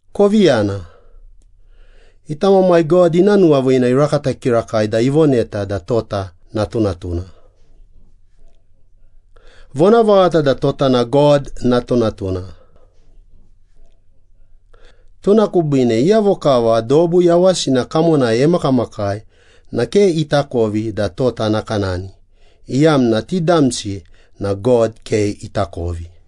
Kovi yana, ita Mamai God ina nuwaviina irakata kirakai da ivoneta da tota natunatuna. Vonavaghata da tota na God natunatuna. Tuna kubiine iyavo kava dobu yawasina kamonai emakamakai na ke itakovi da tota nakanani, iyamna ti damsi na God ke itakovi.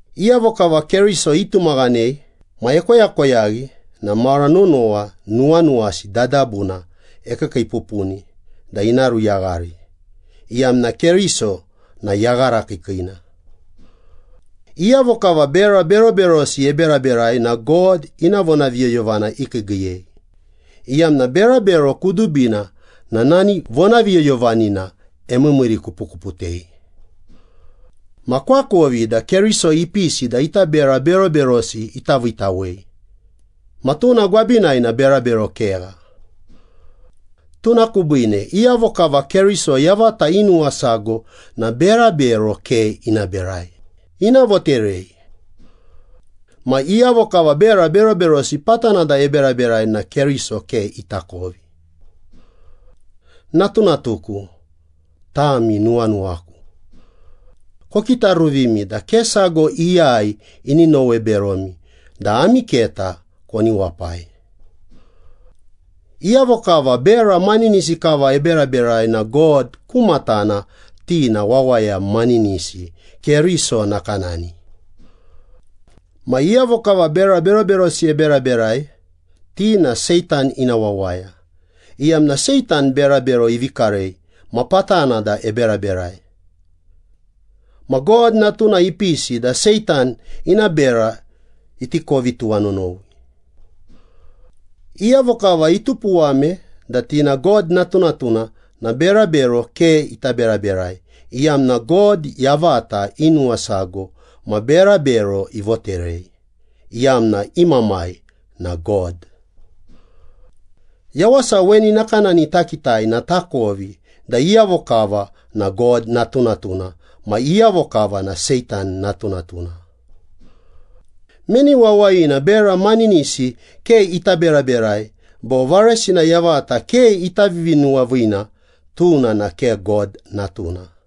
Iyavo kava Keriso itumaghanei ma ekoyakoyaghi na mara nonowa nuwanuwasi dadabuna ekiikiipupuni da ina ruyaghari, iyamna Keriso na yagharakiikiina. Iyavo kava bera beroberosi eberaberai na God ina vonaviyoyovana ikiigiiyei, iyamna berabero kudubina na nani vonaviyoyovanina emiimiirikupukuputei. Ma koakovi da Keriso ipisi da ita bera beroberosi ita viitawei, ma tuna gwabinai na berabero kegha. Tuna kubiine iyavo kava Keriso yavata inuwasago na berabero ke ina berai, ina voterei. Ma iyavo kava bera beroberosi patana da eberaberai na Keriso ke itakovi. Natunatuku, tami nuwanuwaku. Kokitaruvimi da ke sago iyai ini nowe beromi da ami keta koni wapai. Iyavo kava bera maninisi kava eberaberai na God ku matana ti na wawaya maninisi, Keriso nakanani. Ma iyavo kava bera beroberosi eberaberai, ti na Seitan ina wawaya, iyamna Seitan berabero ivi karei ma patana da eberaberai. Ma God Natuna ipisi da Seitan ina bera iti kovi tuwanonowi. Iyavo kava itupuwame da ti na God natunatuna na berabero ke ita beraberai, iyamna God yavata inuwasago ma berabero ivoterei, iyamna i Mamai na God. Yawasa weni nakanani takitai na takovi da iyavo kava na God natunatuna ma iyavo kava na Seitan natunatuna. Meni wawayina bera maninisi ke ita beraberai bo varesina yavata ke ita vivinuwaviina, tuna na ke God natuna.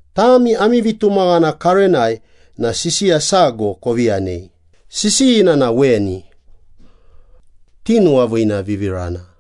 Tami ami vitumaghana karenai na sisiya sago kovi yanei, sisiyina na weni. Tinuwaviinavivirana.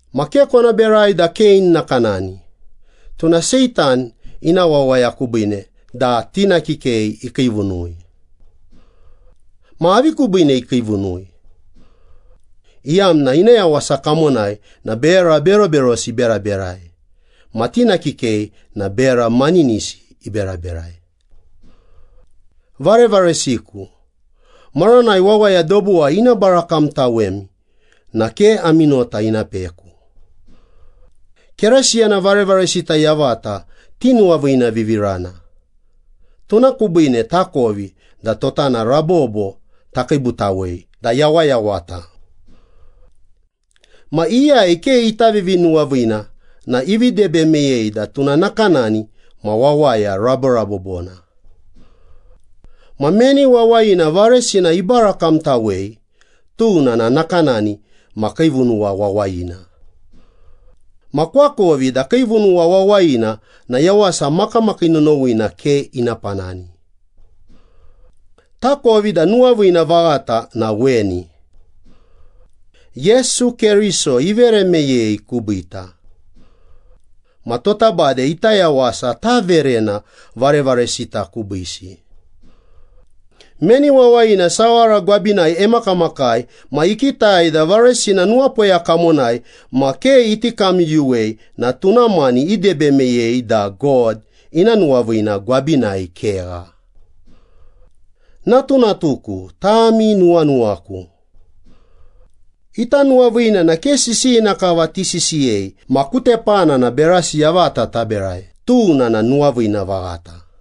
Ma ke kona berai da Kein nakanani, tuna Seitan ina wawaya kubiine da tina kikei ikiivunui. Ma avi kubiine ikiivunui? Iyamna ina yawasa kamonai na bera beroberosi iberaberai ma tina kikei na bera maninisi iberaberai. Varevaresiku, maranai wawaya dobuwai ina barakamtawemi na ke ami nota ina peku. Keresiyana varevaresita yavata tinuwaviinavivirana, tuna kubiine takovi da tota na rabobo takiibutawei da yawayawata. Ma iyai ke ita vivinuwaviina na ivi debe meyei da tuna nakanani ma wawaya raborabobona. Ma meni wawayina varesina ibarakamtawei, tuna na nakanani ma kiivunuwa wawayina. Ma koakovi da kiivunuwa wawayina na yawasa makamakii nonowina ke ina panani. Takovi da nuwaviina vaghata na weni. Yesu Keriso ivere meyei kubiita. Ma tota bade ita yawasa taverena varevaresita kubiisi. Meni wawayina sawara gwabinai emakamakai ma ikitai da varesina nuwapoya kamonai ma ke iti kamyuyuwei na tuna mani idebe meyei da God ina nuwaviina gwabinai kegha. Natunatuku, tami nuwanuwaku. Ita nuwaviina na ke sisiyina kava tisisiyei ma ku tepana na berasi yavata taberai, tuna na nuwaviina vaghata.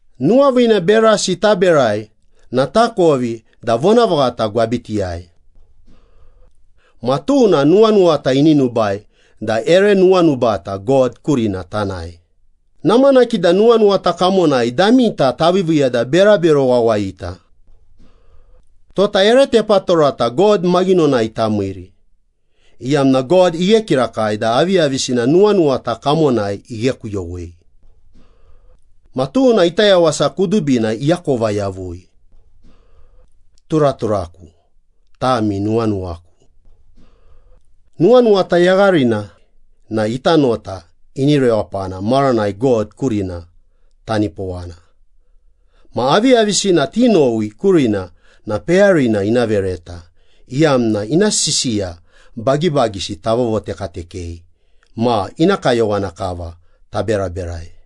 Nuwaviina berasi taberai na takovi da vonavaghata gwabitiyai. Ma tuna nuwanuwata inubai da ere nuwanubata God kurina tanae, namanaki da nuwanuwata kamonai damita taviiviiya da berabero wawayita. Tota ere tepatorata God maghinonai tamiiri, iyamna God ighe kirakai da aviyavisina nuwanuwata kamonai ighekuyowei. Ma tuna ita yawasa kudubina iakova yavui. Turaturaku, tami nuwanuwaku. Nuwanuwata yagharina na ita nota ini rewapana maranai God kurina tanipowana, ma aviyavisina tinowi kurina na peyarina ina vereta, iyamna ina sisiya bagibagisi tavovotekatekei ma ina kayowana kava taberaberai.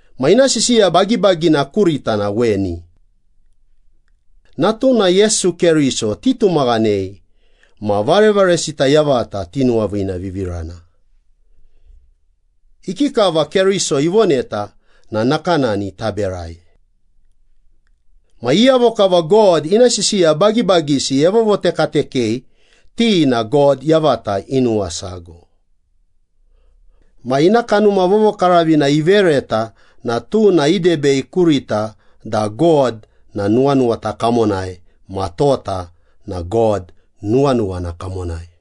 Ma ina sisiya bagibagina kurita na weni. Natuna Yesu Keriso titumaghanei ma varevaresita yavata tinuwaviinavivirana. Ikikava Keriso ivoneta na nakanani taberai. Ma iyavo kava God ina sisiya bagibagisi evovotekatekei, ti na God yavata inuwasago. Ma ina Kanuma Vovokaravina ivereta na tuna idebei kurita da God na nuwanuwata kamonai ma tota na God nuwanuwana kamonai.